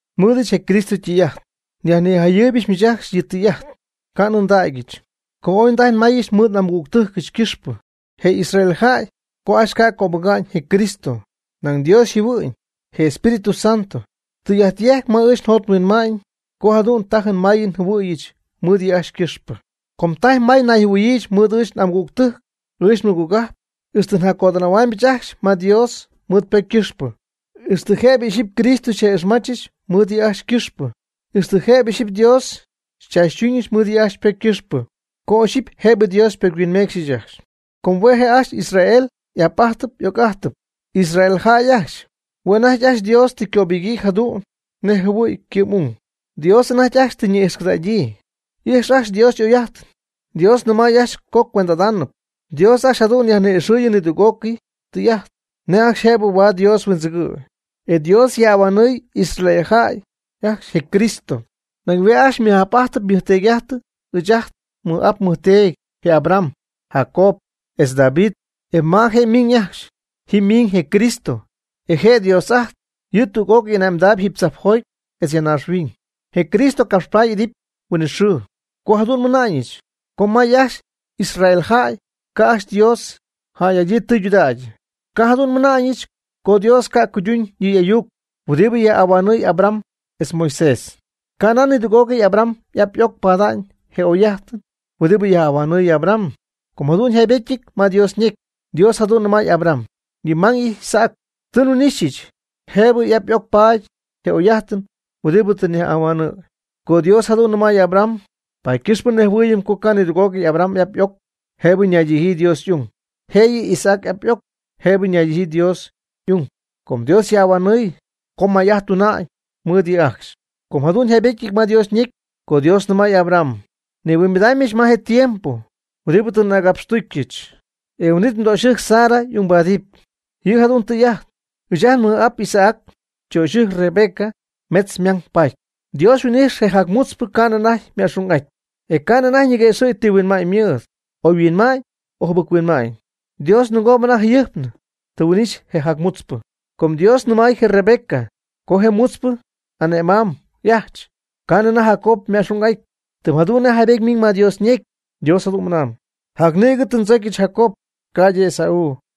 Nmɨɨdɨch je Cristo ytɨy'ajt, nyajnijayɨɨybɨch miich ajcxy yɨ' ytɨy'ajt, ca' n'ɨndägyɨch, co ooy ndajy nmayɨch mɨɨd n'amɨgügtɨjcɨch ycɨxpɨ je Israel jäy co ajcxy ca' cöbɨga'ñ je Cristo. Nañ Dios yjɨhuɨ'ñ, je Espíritu Santo, tɨy'ajt yejcp ma ɨɨch njot nhuinma'ñ co jadu'n tajɨn mayɨn njɨhuɨ̈yɨch mɨɨd yɨ' ajcxy ycɨxpɨ. Com tajy may nayjɨhuɨ̈yiijɨch mɨɨd ɨɨch n'amɨgügtɨjc, ɨɨch nmɨgogajp, ixtɨ njaccodɨnähuaamybɨch ajcxy ma Dios mɨɨd ypocy ycɨxpɨ, ixtɨ jëbɨ ixyipy Cristo nja'ixmachɨch mɨɨd yɨ' ajcxy ycɨxpɨ, ixtɨ jëbɨ ixyipy Dios xychaachytuñɨch mɨɨd yɨ' ajcxy ypocy ycɨxpɨ, co ixyipy jëbɨ Dios pocyhuinmecxy ajcxy. Com hue' je' ajcxy Israel y'ap'ajtɨp y'oc'ajtɨp, Israel jäy ajcxy. Hue' anajty ajcxy Dios tɨ ycöbɨgyii jadu'n nej jɨhuɨ̈y ycɨ'm'ung, Dios anajty ajcxy tɨ ñi'ijxcɨdägyii, y'ijx ajcxy Dios y'oy'ajtɨn. Dios nɨmay ajcxy co ycuend'adip. Dios ajcxy jadu'n yajni'ixɨɨyɨ nidüg'ócɨy tɨy'ajt nej ajcxy jëbɨ huaad Dios huindzɨgɨ̈y, e Dios yajhuinhuanɨɨy Israel jäy ajcxy je Cristo. Nañ hue' ajcxy ymɨj'ap'ajtɨp ymɨjteedy'ajtɨp ɨɨch ajt nmɨj'ap nmɨjteedy; je Abraham, Jacob, etz David, e ma je' ymiñ ajcxy, ji ymiñ je Cristo, e je' je' Dios ajtp, yɨ' tüg'ócɨy ane'mdaayb jiiby tzajpjoty etz ya naaxhuiñ. Je Cristo capxpaady y'idɨpy huinɨxɨɨ. Co jadu'n mɨna'ñɨch co may ajcxy Israel jäy ca' ajcxy Dios yjäy'adyii tɨydudägyɨ, ca' jadu'n mɨna'na'ñɨch co Dios ca' cuyduñ yɨ' y'ayuc huɨdibɨ yajhuinhuanɨɨy Abraham etz Moisés. Canan nidüg'ócɨy Abraham y'ap y'oc pada'ñ je oy'ajt huɨdibɨ yajhuinhuanɨɨy Abraham, com jadu'n yjaybetyɨty ma Dios ñecy. Dios jadu'n nɨmay Abraham: “Yɨ mmang, Isaac, tɨ nhuin'ixyɨch jëbɨ y'ap y'oc paady je oy'ajt huɨdibɨ tɨ nyajhuinhuanɨ̈y.” Co Dios jadu'n nɨmay Abraham, paady ycɨxpɨ nejhuɨɨyɨm co ca' nidüg'ócɨy Abraham y'ap y'oc jëbɨ naydijyii Dios y'ung. Jëyɨ Isaac y'ap y'oc jëbɨ ñaydijyii Dios y'ung com Dios yajhuinhuanɨɨy co may'ajt tuna'ñ mɨɨd yɨ' ajcxy. Com jadu'n yjaybetyɨty ma Dios ñecy co Dios nɨmay Abraham: “Nihuimbidaamybɨch ma je tiempo huɨdibɨ tɨ n'agapxtucyɨch, e huin'it mdöxyɨjc Sara y'ungbaadɨp.” Ji jadüg tɨy'ajt. Ɨɨch ajt nmɨj'ap Isaac ytöxyɨjc Rebeca metz ymang paty. Dios yhuin'ijx je jacmutzpɨ ca'nɨ anajty yma'xung'aty, e ca'nɨ anajty ñiguëxɨ̈gy ti huinma'ñ ymɨɨd, oyhuinma'ñ o jɨbɨc-huinma'ñ. Dios ninɨgoob anajty jayɨjpnɨ tɨ huin'ixy je jacmutzpɨ. Com Dios ñɨmay je Rebeca co je jacmutzpɨ y'ane'mamyb y'ajch ma ca'nɨ anajty Jacob yma'xung'atyñɨ. Tɨm jadu'n nej jaybety ymiñ ma Dios ñecy, Dios jadu'n mɨnañ: “Jac nïgɨ tɨ ndzocyɨch Jacob, ca'ydɨ Esaú.”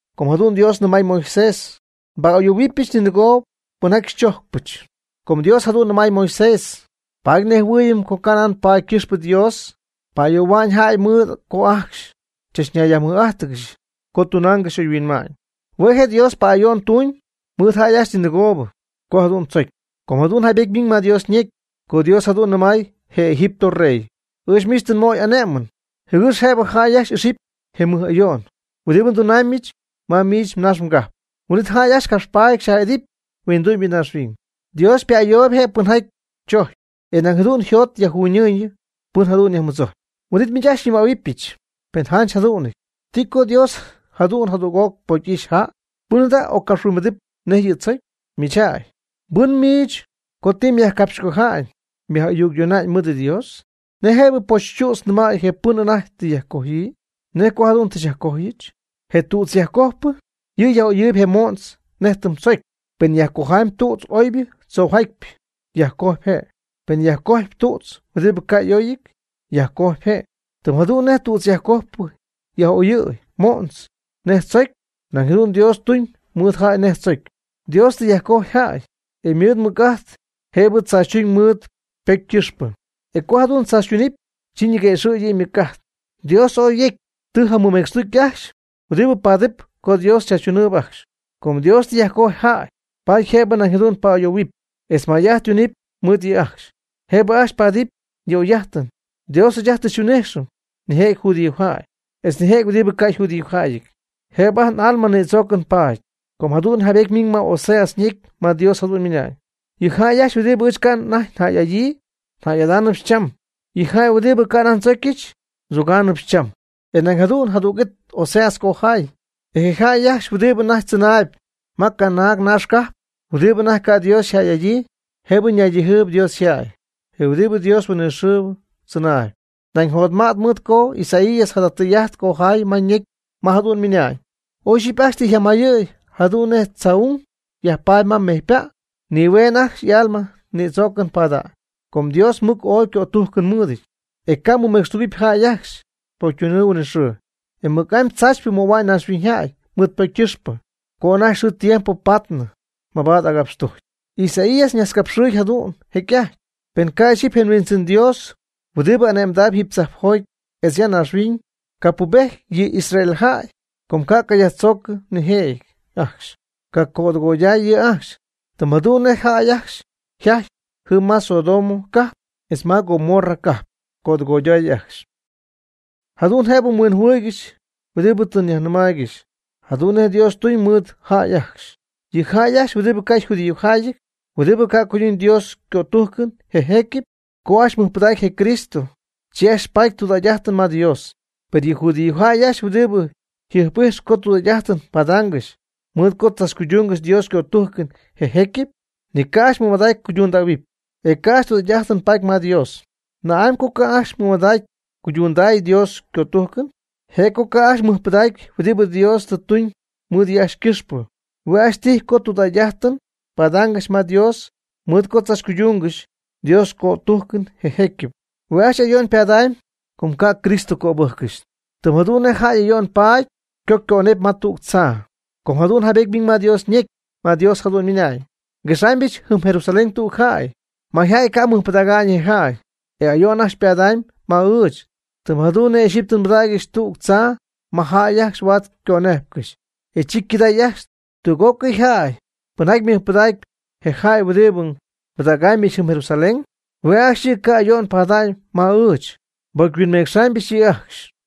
Com jadu'n Dios nɨmay Moisés: “Nba'ayohuɨpyɨch ninɨgoobɨ pɨnjaty ndzojcpyɨch.” Co Dios jadu'n nɨmay Moisés paady nejhuɨɨyɨm co canan paady ycɨxpɨ Dios pa'ayohua'ñ jay mɨɨd co ajcxy chachñaymɨja'íjxɨgɨxy co tunaangɨxy oyhuinma'ñ. Hue' je' Dios pa'ayo'n tuñ mɨɨd jäy ajcxy ninɨgoob co jadu'n tzocy. Com jadu'n jaybety ymiñ ma Dios ñecy co Dios jadu'n nɨmay je Egipto rey: Ɨɨch miich tɨ nmöy m'ane'mɨn, jɨgɨx jëbɨ jäy ajcxy ixɨpy je mɨj ayo'n huɨdibɨ ndunaamybɨch ma miich mnaax mgajp, huin'it jäy ajcxy capxpaady xyaj'idɨpy huindu'ñybɨ ñaaxhuiñ. Dios ypa'ayooyb je' pɨnjaty chojcpy, e nañ jadu'n yjot yajjuunɨ pɨn jadu'n yajmɨdzojcpy. Huin'it miich ajcxy xyñɨmähuɨbɨch: “Penɨ janch yjadu'nɨty, ¿ti co Dios jadu'n jadüg'oc pocy'ixy jäy? ¿Pɨn jada' occapxhuimbidɨp nej yɨ' tzocyɨ?” Miich jäy, ¿mbɨn miich co tɨ myajcapxycoja'ñ myaj'ayuccoja'ñ mɨɨd Dios? ¿Nej jëbɨ pochytüdz nɨmäy je pɨn anajty tɨ yajcojyii? “¿Nej co jadu'n tɨ xyajcojyɨch?” Tüdzyajcojpɨ yɨ' yaj'oyɨɨyb je mo'ntz nej tɨm tzocy. Pen yajcojamyb tüdz oybɨ tzoojatypɨ, yajcojpy je'. Penɨ yajcojamyb tüdz huɨdibɨ ca' oyjatyɨty, yajcojpy je'. Tɨm jadu'n nej je tüdzyajcojpɨ yaj'oyɨɨy mo'ntz nej tzocy, nañ jadu'n Dios tuñ mɨɨd jäy nej tzocy. Dios tɨ yajcojy jäy, e mɨɨd ymɨc'ajt jëb tzaachytuñ mɨɨd ypocy ycɨxpɨ. E co jadu'n tzaachytunɨpy, chi ñiguëxɨ̈gɨpy yɨ' ymɨc'ajt. Dios ooy jecy tɨ jamɨmecxtucy ajcxy huɨdibɨ paatɨp co Dios chaachytunɨɨyb ajcxy. Com Dios tɨ yajcojy jäy paady jëb nañ jadu'n pa'ayoohuɨpy etz may'ajt tunɨpy mɨɨd yɨ' ajcxy, jëbɨ ajcxy paadɨp yɨ' y'oy'ajtɨn. Dios ɨɨch ajt tɨ xyhuin'ijxɨm nijëjɨty judíojäy, etz nijëjɨty huɨdibɨ ca' yjudíojäyɨty, jëbɨ ajt n'alma nïdzoocɨn paady. Com jadu'n jaybety ymiñ ma Oseas ñecy ma Dios jadu'n ymɨnañ: Yɨ jäy ajcxy huɨdibɨ ɨɨch ca' anajty njäy'adyii, njäy'adáanɨbɨch cham. Yɨ jäy huɨdibɨ ca' anajty ndzocyɨch, ndzogáanɨbɨch cham. E nañ jadu'n jadüg'it Oseas cojay: “E je jäy ajcxy huɨdibɨ anajty tzɨnaayb ma canaag naax cajp huɨdibɨ anajty ca' Dios yjäy'adyii, jëb ñaydijyii Dios yjäy, je Dios huɨdibɨ huinɨxɨɨ tzɨnaayb.” Nañ jotmay mɨɨd co Isaías jada tɨy'ajt ycojay ma ñecy ma jadu'n ymɨna'ñ: “Oy ixyipy ajcxy tɨ yjamayɨ̈y jadu'n nej tzaa'ung yajpaady ma mejy ypa', nihueeñ ajcxy y'alma ñïdzoocɨn pada'ñ. Com Dios mɨc ooy cötujcɨn mɨɨdɨty, e ca' mɨmecxtugɨpy jäy ajcxy ypocytunɨɨ huinɨxɨɨ. E mɨc'amy tzaachypɨ möhua'ñ naaxhuinyjäy mɨɨd ypocy ycɨxpɨ co anajty xɨɨ tiempo paatnɨ mabaad agapxtujcy.” Isaías ñajtzcapxɨɨy jadu'n jecy'ajty: Pen ca' ixyipy je Huindzɨn Dios huɨdibɨ ane'mdaayb jiiby tzajpjoty etz ya naaxhuiñ, capubejty yɨ Israel jäy, co ca' ycajacyajtzoocɨ nijëjɨty ajcxy, ycacödɨgoyday yɨ' ajcxy, tɨm jadu'n nej je jäy ajcxy yjajty jɨm ma Sodomo cajp etz Gomorra cajp, cödɨgoyday ajcxy. Jadu'n jëbɨ mhuinjɨhuɨɨygɨxy huɨdibɨ tɨ nyajnijayɨɨygɨxy jadu'n nej Dios ytun mɨɨd jäy ajcxy. Yɨ jäy ajcxy huɨdibɨ ca' yjudíojäyɨty, huɨdibɨ ca' cuyduñ Dios ycötujcɨn je jecyɨp, co ajcxy mɨjpɨdägy je Cristo, chi ajcxy paady tudägy'ajtɨn ma Dios. Per yɨ judíojäy ajcxy huɨdibɨ jɨjp'ijxp co tudägy'ajtɨn padaangɨxy mɨɨd co tzachcuydungɨxy Dios ycötujcɨn je jecyɨp, ni ca' ajcxy mɨmadägy cuydundähuɨpy, e ca' ajcxy tudägy'ajtɨn paady ma Dios. ¿Na'amy co ca' ajcxy mɨmadägy cuydundäy Dios cötujcɨn? Je' co ajcxy ca' mɨjpɨdägy huɨdibɨ Dios tɨ tuñ mɨɨd yɨ' ajcxy ycɨxpɨ. Hue' ajcxy tijy co tudägy'ajtɨn padaangɨxy ma Dios mɨɨd co tzachcuydungɨxy Dios ycötujcɨn je jecyɨp. Hue' ajcxy ayo'n ypadamyb co ca' Cristo cöbɨjccɨxy, tɨm jadu'n nej jäy ayo'n paady co ycönepy ma tüg tzaa. Com jadu'n jaybety ymiñ ma Dios ñecy, ma Dios jadu'n ymɨna'ñ: Nguexaamybɨch jɨm Jerusalén tüg jäy. Mayjäy ca' mɨjpɨdäga'ñ je jäy, e ayo'n ajcxy ypadamyb ma ɨɨch. Tɨm jadu'n nej ixyipy tɨ nbɨdägyɨch tüg tzaa ma jäy ajcxy huaad ycönejpcɨxy, e chi ycɨday ajcxy. Tüg'ócɨy jäy pɨnjaty mɨjpɨdaacp je jäy huɨdibɨ nbɨdägaamybɨch jɨm Jerusalén, hue' ajcxy yɨ' ca' ayo'n pada'ñ ma ɨɨch, nbocyhuinmecxaamybɨch yɨ' ajcxy.